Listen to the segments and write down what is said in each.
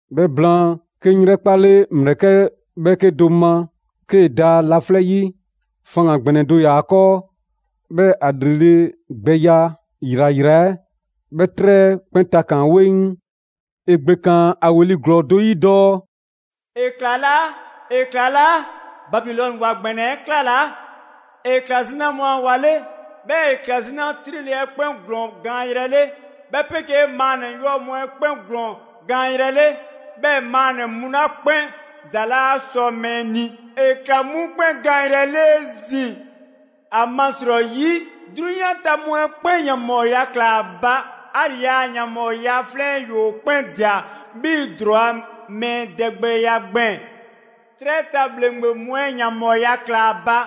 'Bhɛ blaan, 'ke 'ŋ 'yrɛkpale ‑mlɛkɛ' 'bhɛɛke do ma 'kee‑ da laflɛ' 'yi. Faŋgan‑ ‑gbɛnɛ do ‑yaa ‑a 'kɔɔ; 'bhɛɛ‑ ‑a ‑lregbɛya ‑yrayra 'ɛ 'bhɛ 'trɛ 'ɛ 'kpɛn takaan‑ 'weŋ. ‑E ‑gbekaan ‑a ‑weli' ‑glɔɔ do 'yi dɔɔ: «‑E ‑klalaa', ‑e ‑klalaa', Babilɔni ‑wa ‑gbɛnɛ 'ɛ 'klalaa. ‑E ꞊kla 'zina mu a ‑wa 'le, 'bhɛɛ‑ ‑e ‑kla 'ke 'zina 'triŋle‑ 'ɛ 'kpɛn ‑glɔɔn gaanyrɛ 'le; 'bhɛ 'pegee maannɛ‑ 'yɔɔ‑ mu 'ɛ 'kpɛn ‑glɔɔn gaanyrɛ 'le, 'bhɛɛ‑ maannɛ‑ mu 'la 'kpɛn ‑za 'laa sɔ mɛɛ ni, ‑e ‑kla 'mu 'kpɛn gaanyrɛ 'le 'ezin‑. ‑Amasrɔyi, 'drunyan ta mu 'ɛ 'kpɛn ‑yanbhɔɔya ꞊kla ‑a ba, 'ali‑ ‑yaa' ‑yanbhɔɔya 'flɛn 'ɛ ‑yoo 'kpɛn ꞊dia 'bhii ‑drɔɔ a mɛɛ dɛgbɛya gbɛɛn‑. 'Trɛ ta ‑bhleŋgbe mu 'ɛ ‑yanbhɔɔya ꞊kla ‑a ba,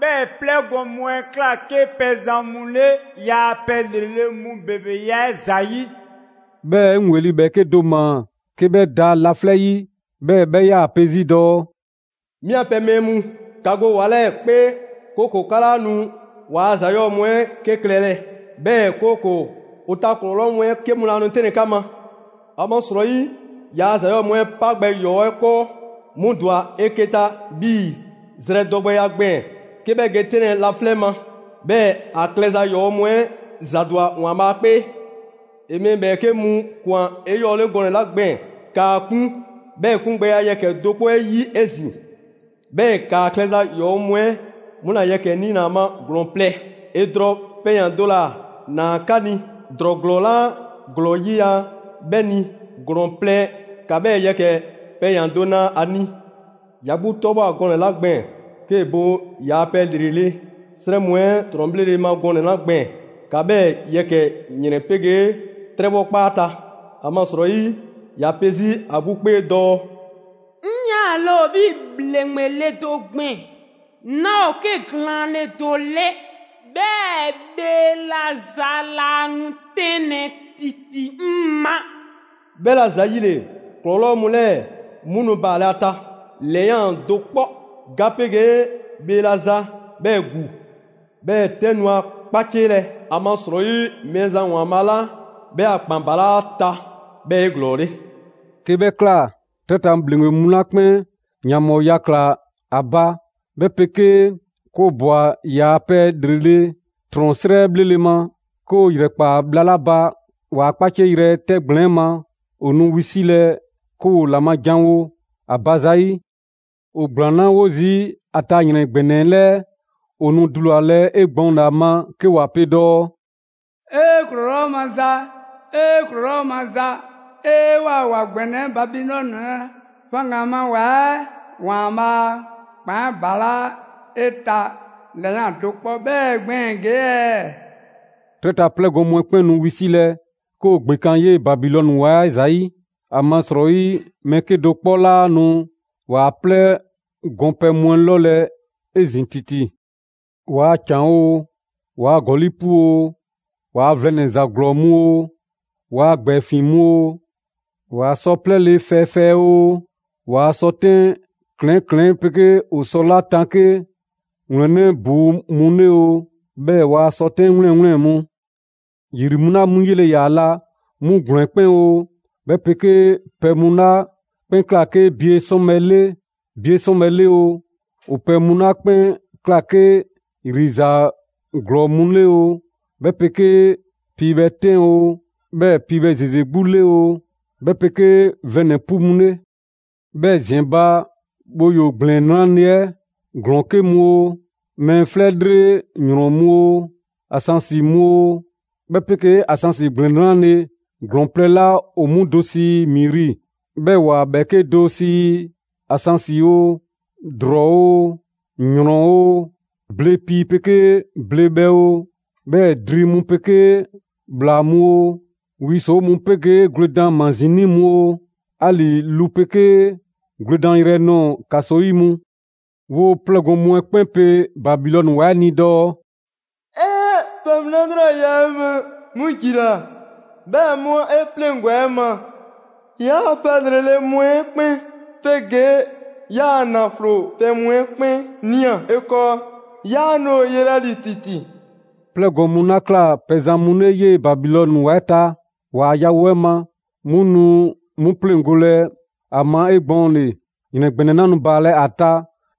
'bhɛɛ‑ 'plɛɛgɔn‑ mu 'ɛ ꞊kla 'ke pɛzan mu 'le ‑yaa' pɛ ‑lrele' mu ‑bebeya 'ɛ ‑zayi'.» 'Bhɛɛ‑ 'ŋ ‑weli' ‑bhɛɛke' do ꞊maa 'ke 'bhɛ da laflɛ' 'yi, 'bhɛɛ‑ 'bhɛ 'yaa‑ pe 'zi dɔɔ: «'Mi a pɛ mɛɛ mu, ‑ka go ‑wa 'lɛɛ‑ 'kpee, 'kooko‑ 'ka 'laa nu ‑waa' ‑za 'yɔɔ‑ mu 'ɛ 'ke klɛlɛ, 'bhɛɛ‑ 'kooko‑ ‑o ta ‑klɔlɔɔ mu 'ɛ 'ke mu laa nu 'tɛnlɛ‑ 'ka ma. ‑Amasrɔyi, ‑yaa' ‑za 'yɔɔ‑ mu 'ɛ 'pa gbɛ ‑yɔɔ' 'ɛ 'kɔɔ, 'mu ‑dwa 'eke‑ ta 'bhii‑ zrɛ dɔgbɛya gbɛɛn‑ 'ke 'bhɛ ge 'tɛnlɛ‑ laflɛ' ma. 'Bhɛɛ‑ ‑a klɛza ‑yɔɔ' mu 'ɛ ‑zadwa ‑Waanbhaa' 'kpee. ‑E mɛɛ ‑bhɛɛke' mu ꞊kwan 'eyɔɔle gɔnɛ‑ 'la gbɛɛn‑, ‑kaa 'kun 'bhɛɛ‑ 'kungbɛya yɛkɛ‑ do 'kpɔ 'ɛ 'yi 'ezin‑; 'bhɛɛ‑ ‑kaa klɛza ‑yɔɔ' mu 'ɛ 'mu ‑la yɛkɛ‑ 'niina‑ ‑a ma ‑glɔɔn plɛ. ‑E ‑drɔɔ pɛyan‑ do 'la ꞊naa 'ka ni, ‑drɔɔ ‑glɔɔ 'la ‑glɔɔ 'yiya‑ 'bhɛ ni ‑glɔɔn plɛ ‑ka 'bhɛɛ‑ yɛkɛ‑ pɛyan‑ do na ‑a ni. ‑Ya 'gbu 'tɔbhwa‑ gɔnɛ‑ 'la gbɛɛn‑, 'kee‑ bo ‑yaa' pɛ ‑lrele' 'srɛ mu 'ɛ 'trɔnbhlele ma gɔnɛ‑ 'la gbɛɛn‑, ‑ka 'bhɛɛ‑ yɛkɛ‑ ‑yrɛn 'pegee 'trɛbhɔ 'kpa ‑a ta. ‑Amasrɔyi ‑ya pe 'zi ‑a 'gbu 'kpee dɔɔ: ‹'Ŋ 'yaale‑ ‑o 'bhii‑ ‑bhleŋgbe le do gbɛɛn‑, 'naa ‑o 'ke glaanle do 'le, 'bhɛɛ‑ bheela za laa nu 'tɛnlɛ‑ ‑titi 'ŋ ma.› 'Bhɛla‑ ‑zayile, ‑klɔlɔɔ' mu 'lɛɛ‑ 'mu nu baalɛ ‑a ta ‑lɛyan' do 'kpɔ: Ga 'pegee bhee la za, 'bhɛɛ‑ ‑gu. 'Bhɛɛ‑ 'tɛ nu ‑a 'kpacielɛ, ‑amasrɔyi Mɛɛzan ‑Waanbhaa' 'la 'bhɛ a ‑kpan 'a ‑balaa' 'a ta 'bhɛ ‑o 'eglɔɔle.» 'Ke 'bhɛ ꞊kla, 'trɛ ta ‑bhleŋgbe mu 'la 'kpɛn ‑yanbhɔɔya ꞊kla ‑a ba, 'bhɛ 'pegee 'ke ‑o ꞊bwa ‑yaa' pɛ ‑lrele' ‑trɔn 'srɛ 'ɛ 'bhlele‑ ma, 'ke ‑o ‑yrɛkpaa bhla 'la ba ‑wa 'ɛ 'kpacieyrɛ 'tɛgblɛn‑ 'ɛ ma; ‑o nu wisilɛ 'ke ‑woo ‑la ma janwo ‑a ba zayi'. ‑O ‑gblaanlawo zii' ‑a ta ‑yrɛn ‑gbɛnɛ 'ɛ 'lɛɛ, ‑o nu dulalɛ 'egbɔɔnle ‑a ma, 'ke ‑wa pe dɔɔ: «'Ee ‑klɔlɔɔ' maza! 'Ee ‑klɔlɔɔ' maza! 'Ee, 'waa‑ ‑wa ‑gbɛnɛ Babilɔni 'ɛ, faŋgan‑ ma ‑wa 'ɛ! ‑Waanbhaa' a ‑kpan 'ɛ ‑balaa' 'e ta ‑lɛyan' do 'kpɔ 'bhɛɛ‑ gbɛɛn‑ ‑gee' ɛɛ!» 'Trɛ ta 'plɛɛgɔn‑ mu 'ɛ 'kpɛn nu wisilɛ 'ke ‑o ‑gbekan' 'yee‑ Babilɔni ‑wa 'ɛ ‑zayi', ‑amasrɔyi mɛɛ 'kedo‑ 'kpɔ 'laa nu ‑waa' 'plɛɛ gɔnpɛ mu 'ɛ 'lɔlɛ‑ 'ezin‑ ‑titi: ‑waa' ‑can oo, waa ‑gɔli' 'pu oo, waa vlɛnɛ‑ ‑za ‑glɔɔ mu oo, waa ‑gbɛɛfiŋ mu oo, waa sɔ 'plɛɛle‑ fɛɛfɛɛ oo, waa sɔ 'tɛn ‑klɛɛn' ‑klɛɛn' 'pegee ‑o sɔ 'la ꞊taan 'ke ‑wlɛnnɛ' ‑buu' mu 'le oo, 'bhɛɛ‑ waa sɔ 'tɛn 'wleŋwleŋ mu. ‑Yri mu 'la 'mu yele ‑yaa la 'mu ‑glɔɔn 'ɛ 'kpɛn oo; 'bhɛ 'pegee ‑o pɛ mu 'la 'kpɛn ꞊kla 'ke bie 'sɔnbhɛ‑ 'le oo, ‑o ‑ pɛ mu 'la 'kpɛn ꞊kla 'ke ‑yri ‑za ‑glɔɔ mu 'le oo, 'bhɛ 'pegee piibhɛ 'tɛn 'le oo, 'bhɛɛ‑ piibhɛ ‑zeze 'gbu 'le oo, 'bhɛ 'pegee vlɛnɛ‑ 'pu mu 'le. 'Bhɛɛ‑ ‑ziɛn ba bhoyo‑ ‑gblɛn 'nrale‑ 'ɛ ‑glɔɔn 'ke mu oo, mɛɛ 'flɛ 'lre ‑yrɔn mu oo, ansansi mu oo, 'bhɛ 'pegee ansansi ‑gblɛn 'nrale‑ ‑glɔɔn plɛ 'la ‑o 'mu do sii miri, 'bhɛɛ‑ ‑wa ‑bhɛɛke' do 'ɛ sii ansansi oo; ‑drɔɔ oo, ‑yrɔn oo, ble pii 'pegee ble bhɛ oo; 'bhɛɛ‑ dri mu 'pegee ‑bhlaa mu oo, wi ‑soo' mu 'pegee gwledan ‑mazini 'mu oo; 'ali‑ lu 'pegee gwledanyrɛ nɔɔ‑ ‑kaso 'yi mu. 'Woo‑ 'plɛɛgɔn‑ mu 'ɛ 'kpɛn pe Babilɔni ‑wa 'ɛ ni dɔɔ: «'Ee! Pɛ mu 'la 'lrɔ ‑yaa 'e ma, 'mu ‑jilaa, 'bhɛɛ‑ 'mu 'e pleŋgwa‑ 'e ma. 'Yaa‑ pɛ ‑lrele' mu 'ɛ 'kpɛn 'pegee 'yaa‑ ‑naflo pɛ mu 'ɛ 'kpɛn ꞊nia 'e 'kɔɔ. 'Yaa nu ‑o yelɛ ‑li ‑titi.» 'Plɛɛgɔn‑ mu 'la ꞊kla pɛzan mu 'le 'yee‑ Babilɔni ‑wa 'ɛ ta ‑waa' yawo 'ɛ ma, 'mu nu 'mu 'pleŋgolɛ ‑a ma 'egbɔɔnle, ‑yrɛn ‑gbɛnɛ 'la nu baalɛ ‑a ta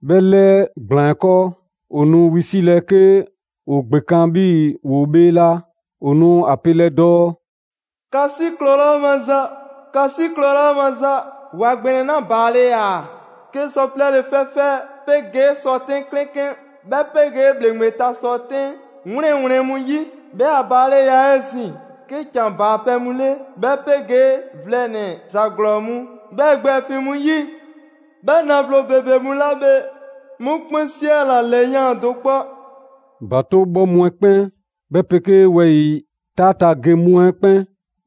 'bhɛ 'lɛɛ ‑gblaan 'ɛ 'kɔɔ. ‑O nu 'wisilɛ 'ke ‑o ‑gbekan' 'bhii‑ ‑woo bhee la. ‑O nu ‑a pelɛ dɔɔ: «‑Kasi' ‑klɔlɔɔ' maza! ‑Kasi' ‑klɔlɔɔ' maza! ‑Wa ‑gbɛnɛ 'la ‑baale' ‑yaa 'ke sɔ 'plɛɛle‑ fɛɛfɛɛ, 'pegee sɔ 'tɛn ‑klɛɛn' ‑klɛɛn', 'bhɛ 'pegee ‑bhleŋgbe ta sɔ 'tɛn 'wleŋwleŋ mu 'yi; 'bhɛɛ‑ ‑a ‑baale' ‑yaa' 'ezin‑ 'ke ‑can ‑baa pɛ mu 'le, 'bhɛ 'pegee vlɛnɛ‑ ‑za ‑glɔɔ mu, 'bhɛɛ‑ ‑gbɛɛfiŋ mu 'yi. 'Bhɛ ‑naflo ‑bebe mu 'la bhe 'mu 'kpɛn 'siɛla‑ ‑lɛyan' do 'kpɔ!» ‑Batoŋ' 'bhɔ mu 'ɛ 'kpɛn, 'bhɛ 'pegee wɛyi‑ 'taa ta ge mu 'ɛ 'kpɛn,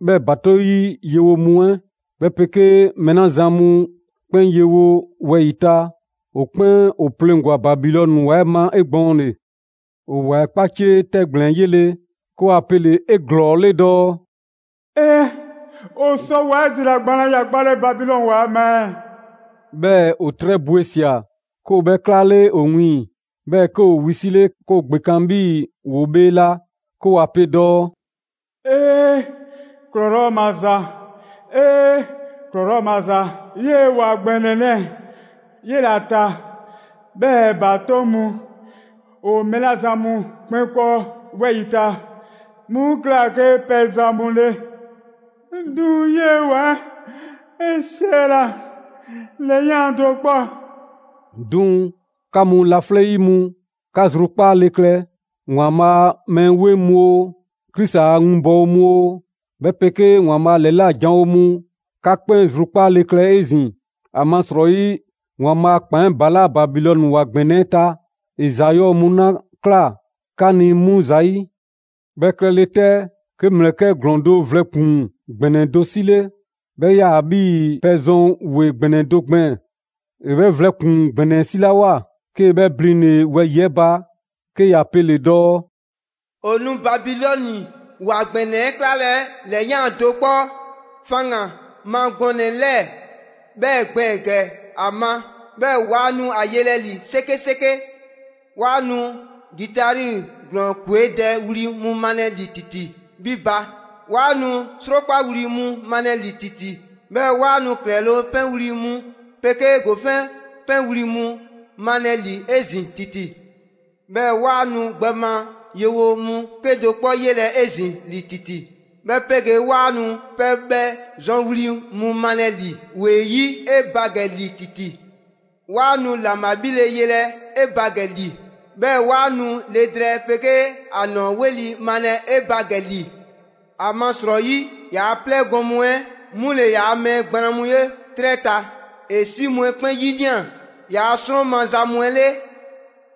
'bhɛɛ‑ ‑batoŋ' 'yi yewo mu 'ɛ, 'bhɛ 'pegee mɛɛ 'la zan mu 'kpɛn yewo wɛyi‑ ta; ‑o 'kpɛn ‑o pleŋgwa‑ Babilɔni ‑wa 'ɛ ma 'egbɔɔnle. ‑O ‑wa 'ɛ 'kpacie 'tɛgblɛn‑ 'ɛ 'yele‑, 'ke ‑wa pele‑ 'eglɔɔle dɔɔ: «'Ee! ‑O sɔ ‑wa 'ɛ ‑dela gblaanya 'kpale Babilɔni ‑wa 'ɛ ma ɛɛ?» 'Bhɛɛ‑ ‑o 'trɛbwe‑ ꞊sia, 'ke ‑o 'bhɛ 'klale ‑o wiiŋ‑, 'bhɛɛ‑ 'ke ‑o wisile 'ke ‑o ‑gbekan' 'bhii ‑woo bhee ‑la, 'ke ‑wa pe dɔɔ: «'Ee ‑klɔlɔɔ' maza! 'Ee ‑klɔlɔɔ' maza! 'Yee‑ ‑wa ‑gbɛnɛ 'lɛɛ‑ 'yela‑ ta 'bhɛɛ‑ ‑batoŋ' mu ‑o mɛɛ 'la zan mu 'kpɛn 'kɔɔ wɛyi‑ ta, 'mu ꞊kla 'ke pɛzan mu 'le. 'Duŋ‑ 'yee‑ ‑wa 'ɛ 'siɛla‑ ‑lɛyan' do 'kpɔ.» 'Duŋ‑ 'ka mu laflɛ' 'yi mu, 'ka zrukpaale klɛ! ‑Waanbhaa' a mɛɛ 'weŋ mu oo, Krisi a winbɔwo mu oo, 'bhɛ 'pegee ‑Waanbhaa' ‑lɛla' janwo mu, 'ka 'kpɛn zrukpaale klɛ 'ezin‑! ‑Amasrɔyi ‑Waanbhaa' a ‑kpan 'ɛ ‑balaa' Babilɔni ‑wa ‑gbɛnɛ 'ɛ ta, ‑e ‑za 'yɔɔ‑ mu 'la ꞊kla 'ka ni 'mu ‑zayi'! 'Bhɛ klɛle 'tɛ, 'ke ‑mlɛkɛ' ‑glɔɔ do vlɛ ‑kpuŋ ‑gbɛnɛ do 'sile, 'bhɛ 'yaa‑ 'bhii‑ pɛbhɛ zɔn ‑wee ‑gbɛnɛ do gbɛɛn‑. ‑E 'bhɛ vlɛ ‑kpuŋ ‑gbɛnɛ 'ɛ 'silawoa, 'kee‑ 'bhɛ blinle‑ wɛyi‑ 'ɛ ba 'ke ‑ya pele‑ dɔɔ: «‑O nu Babilɔni ‑wa ‑gbɛnɛ 'ɛ 'klaalɛ‑ ‑lɛyan' do 'kpɔ faŋgan‑ ma gɔnɛ‑ 'lɛɛ‑ 'bhɛɛ‑ gbɛɛn‑ ‑gee' ‑a ma, 'bhɛɛ‑ waa nu ‑a yelɛ ‑li 'sekeseke. Waa nu ‑gitari ‑glɔɔn gwe dɛ wli mu malɛ ‑li ‑titi 'bhi ba, waa nu 'srokpawli mu malɛ ‑li ‑titi; 'bhɛɛ‑ waa nu ‑klɛloŋ' 'pɛnwli‑ mu, 'pegee ‑gofɛn' 'pɛnwli‑ mu malɛ ‑li 'ezin‑ ‑titi. 'Bhɛɛ‑ waa nu gbɛ ma yewo mu 'kedo‑ 'kpɔ 'yelɛ‑ 'ezin‑ ‑li ‑titi, 'bhɛ 'pegee waa nu pɛbhɛ zɔnwli mu malɛ ‑li ‑wee 'yi 'e ba ‑gɛ ‑li ‑titi. Waa nu ‑laŋbha 'bhile‑ yelɛ 'e ba ‑gɛ ‑li. 'Bhɛɛ‑ waa nu le drɛɛ 'pegee ‑a ‑nɔɔ 'weli‑ malɛ 'e ba ‑gɛ ‑li. ‑Amasrɔyi 'yaa‑ 'plɛɛgɔn‑ mu 'ɛ 'mu ‑le ‑yaa mɛɛ gblaan mu 'le 'trɛ ta. 'E 'si mu 'ɛ 'kpɛn 'yinia‑ ‑yaa' 'srɔn maza mu 'ɛ 'le.»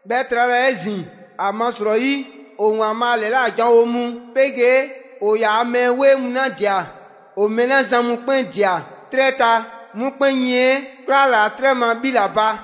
'Bhɛ trala 'ezin‑, ‑amasrɔyi ‑o ‑Waanbhaa' ‑lɛla' janwo mu, 'pegee ‑o ‑yaa' mɛɛ 'weŋ mu 'la ꞊dia, ‑o mɛɛ 'la zan mu 'kpɛn ꞊dia 'trɛ ta, 'mu 'kpɛn yiɛn 'ɛ ‑klalaa' 'trɛ ma 'bhi ‑la ba.